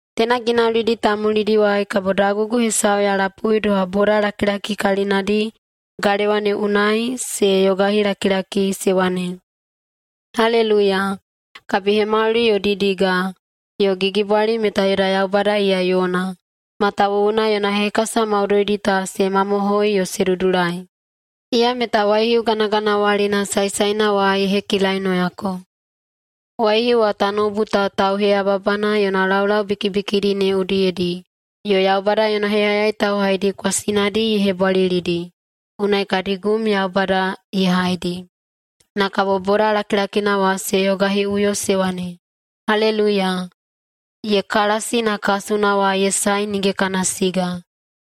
Teina ginaulidi ta mulidiwai kabo dagugu hesau ya lapui doha bodalakilaki kalinadi galewa ne unai se yogahilakilaki se wane, “Haleluiya! Kabihemauli yo didiga yo gigibwali meta yoda Yaubada iya yona, matawuwuna yona hekasa maudoidi ta se mamohoi yo se dudulai. Iya meta waihiu ganaganawalina saesaena wa ye hekilainoyako. Waihiu wa tanoubu ta tauheyababana yona laulau bikibikidi ne udiyedi, yo Yaubada yona heyayai tauhaidi kwasinadi ye hebwalilidi. Unai kadi gum Yaubada ye haidi.” Na kabo boda lakilakina wa se yogahiꞌuyo se wane, “Haleluiya! Ye kalasi na kasuna wa ye sae nige kana siga.”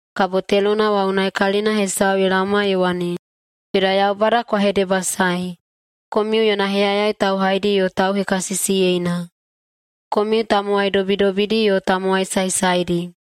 Kabo telona wa unai kalina hesau ye laoma ye wane, “Yoda Yaubada kwa hedebasaei, komiu yona heyayai tauhaidi yo tauhekasisiyeina, komiu tamowai dobidobidi yo tamowai saesaedi.”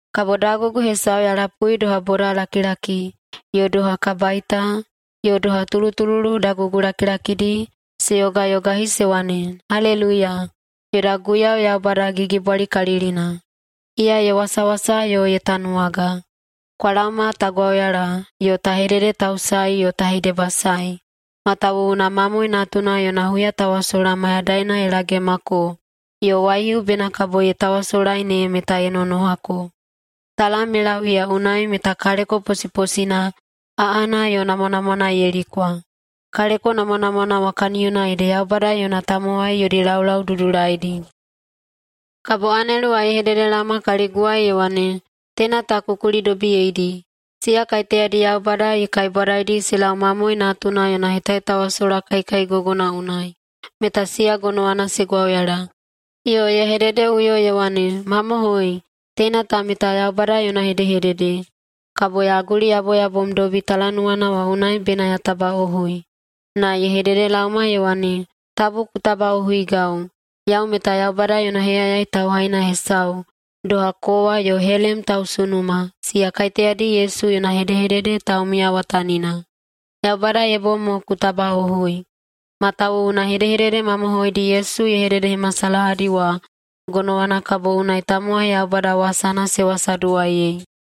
Kabo dagugu hesau ya lapui doha bodalakilaki, yo doha kabaita, yo doha tulutululu dagugulakilakidi, se yogayogahi se wane, “Haleluiya! Yoda Guiyau Yaubada Gigibwalikalilina, iya ye wasawasa yo ye tanuwaga. Kwa laoma ta gwauyala yo ta hededetausaei yo ta hedebasaei! Matawuwuna Mamoe Natuna yona huyatawasola mayadaina ye lagemako yo waihiu bena kabo ye tawasolai ne meta ye nonohako. Talam ye lau iya unai meta kaleko posiposina, aꞌana, yo namwanamwana ye likwa.” Kaleko namwanamwana wa kaniyona ede Yaubada yona tamowai yodi laulau dudulaidi. Kabo anelu wa ye hededelaoma kaliguwai ye wane, “Teina ta ku kulidobiyeidi: Siya kaiteyadi Yaubada ye kaibwadaidi se lau Mamoe Natuna yona hetahetawasola kaikaigogona unai, meta siya gonowana se gwauyala!” Yo ye hededeꞌuyo ye wane, “Mamohoi, teina ta meta Yaubada yona hedehedede.” Kabo ya guliyaboyabomdobi talanuwana wa unai bena ya tabaꞌohui. Na ye hededelaoma ye wane, “Tabu ku tabaꞌohuigau! Yau meta Yaubada yona heyayai tauhaina hesau, doha kowa yo helem tausunuma, siya kaiteyadi Yesu yona hedehedede taumiyawatanina. Yaubada ye bom mo ku tabaꞌohui. Matawuwuna hedehedede mamohoidi Yesu ye hededehemasalahadi wa, gonowana kabo unai tamowai Yaubada wasana se wasaduwaiyei.”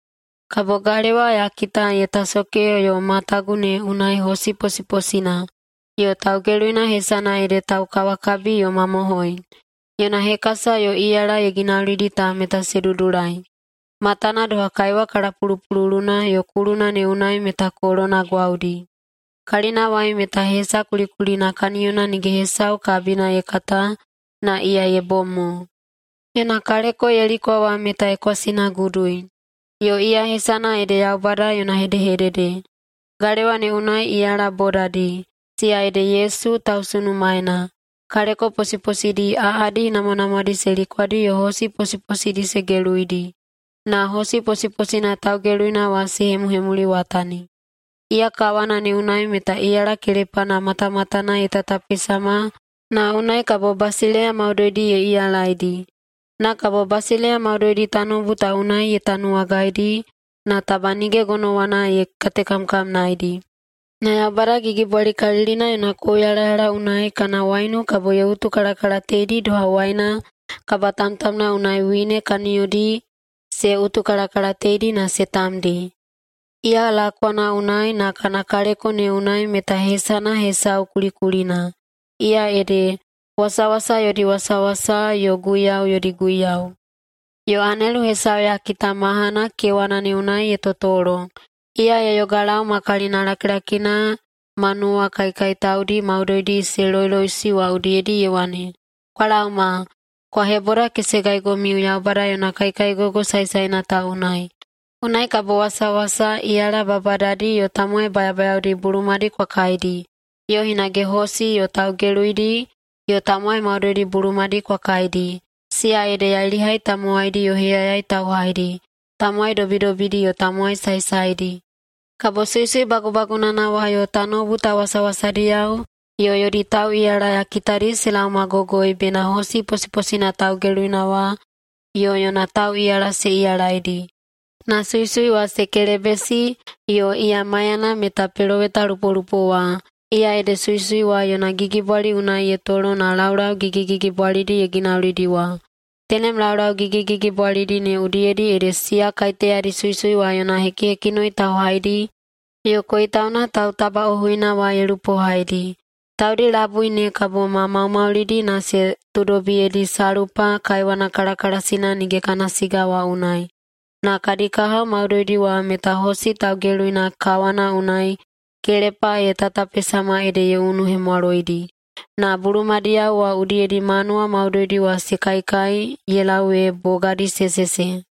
Kabo galewa ya kita ye tasoke yo matagu ne unai hosi posiposina, yo taugeluina hesana ede Taukawakabi yo Mamohoi. Yona hekasa yo iyala ye ginaulidi ta meta se dudulai. Matana doha kaiwa kalapulupululuna yo kuluna ne unai meta kolona gwaudi. Kalinawai meta hesa kulikulina kaniyona nige hesau kabina ye kata na iya ye bom mo. Yona kaleko ye likwa wa meta ye kwasinagudui. Yo iya hesana ede Yaubada yona Hedehedede. Galewa ne unai iyala bodadi, siya ede Yesu tausunumaena, kaleko posiposidi aꞌadi namwanamwadi se likwadi yo hosi posiposidi se geluidi, na hosi posiposina taugeluina wa se hemuhemuliwatani. Iya kawana ne unai meta iyala kelepana matamatana ye tatapesama na unai kabo basileiya maudoidi ye iyalaidi. Na kabo basileiya maudoidi tanoubu ta unai ye tanuwagaidi, na taba nige gonowana ye katekamkamnaedi. Na Yaubada Gigibwalikalilina yona kouyalayala unai kana waiunu kabo ye utukalakalateidi doha waina kabatamtamna unai wine kaniyodi se utukalakalateidi na se tamdi. Iya lakwana unai na kana kaleko ne unai meta hesana hesau kulikulina. Iya ede: Wasawasa yodi Wasawasa yo guiyau yodi Guiyau. Yo anelu hesau ya kita mahana kewana ne unai ye totolo. Iya ye yogalau ma kalinalakilakina manuwa kaikaitaudi maudoidi se loiloiꞌusi wa udiyedi ye wane, “Kwa laoma, kwa hebodakesegaigomiu Yaubada yona kaikaigogo saesaena ta unai. Unai kabo wasawasa, iyala babadadi, yo tamowai bayabayaodi bulumadi kwa kaidi, yo hinage hosi yo taugeluidi yo tamowai maudoidi bulumadi kwa kaidi, siya ede yailihai tamowaidi yo heyayai tauhaidi, tamowai dobidobidi yo tamowai saesaedi!” Kabo suisui bagubagunana wa yo tanoubu ta wasawasadiyao yo yodi tauꞌiyala ya kitadi se laomagogoi bena hosi posiposina taugeluina wa yo yona tauꞌiyala se iyalaidi. Na suisui wa se kelebesi, yo iya maiyana meta pelowetalupolupo wa, iya ede suisui wa yona gigibwali unai ye tolo na laulau gigigigibwalidi ye ginaulidi wa. Tenem laulau gigigigibwalidi ne udiyedi ede siya kaiteyadi suisui wa yona hekihekinoi tauhaidi yo koitauna tautabaꞌohuina wa ye lupohaidi. Taudi labui ne kabo ma maumaulidi na se tuudobiyedi salpa kaiwana kalakalasikalilina nige kana siga wa unai. Na kadi kahao maudoidi wa meta hosi taugeluina kawana unai kelepa ye tatapesama ede ye unuhemwaloidi. Na bulumadiyao wa udiyedi manuwa maudoidi wa se kaikai ye lau ee bogadi se sese.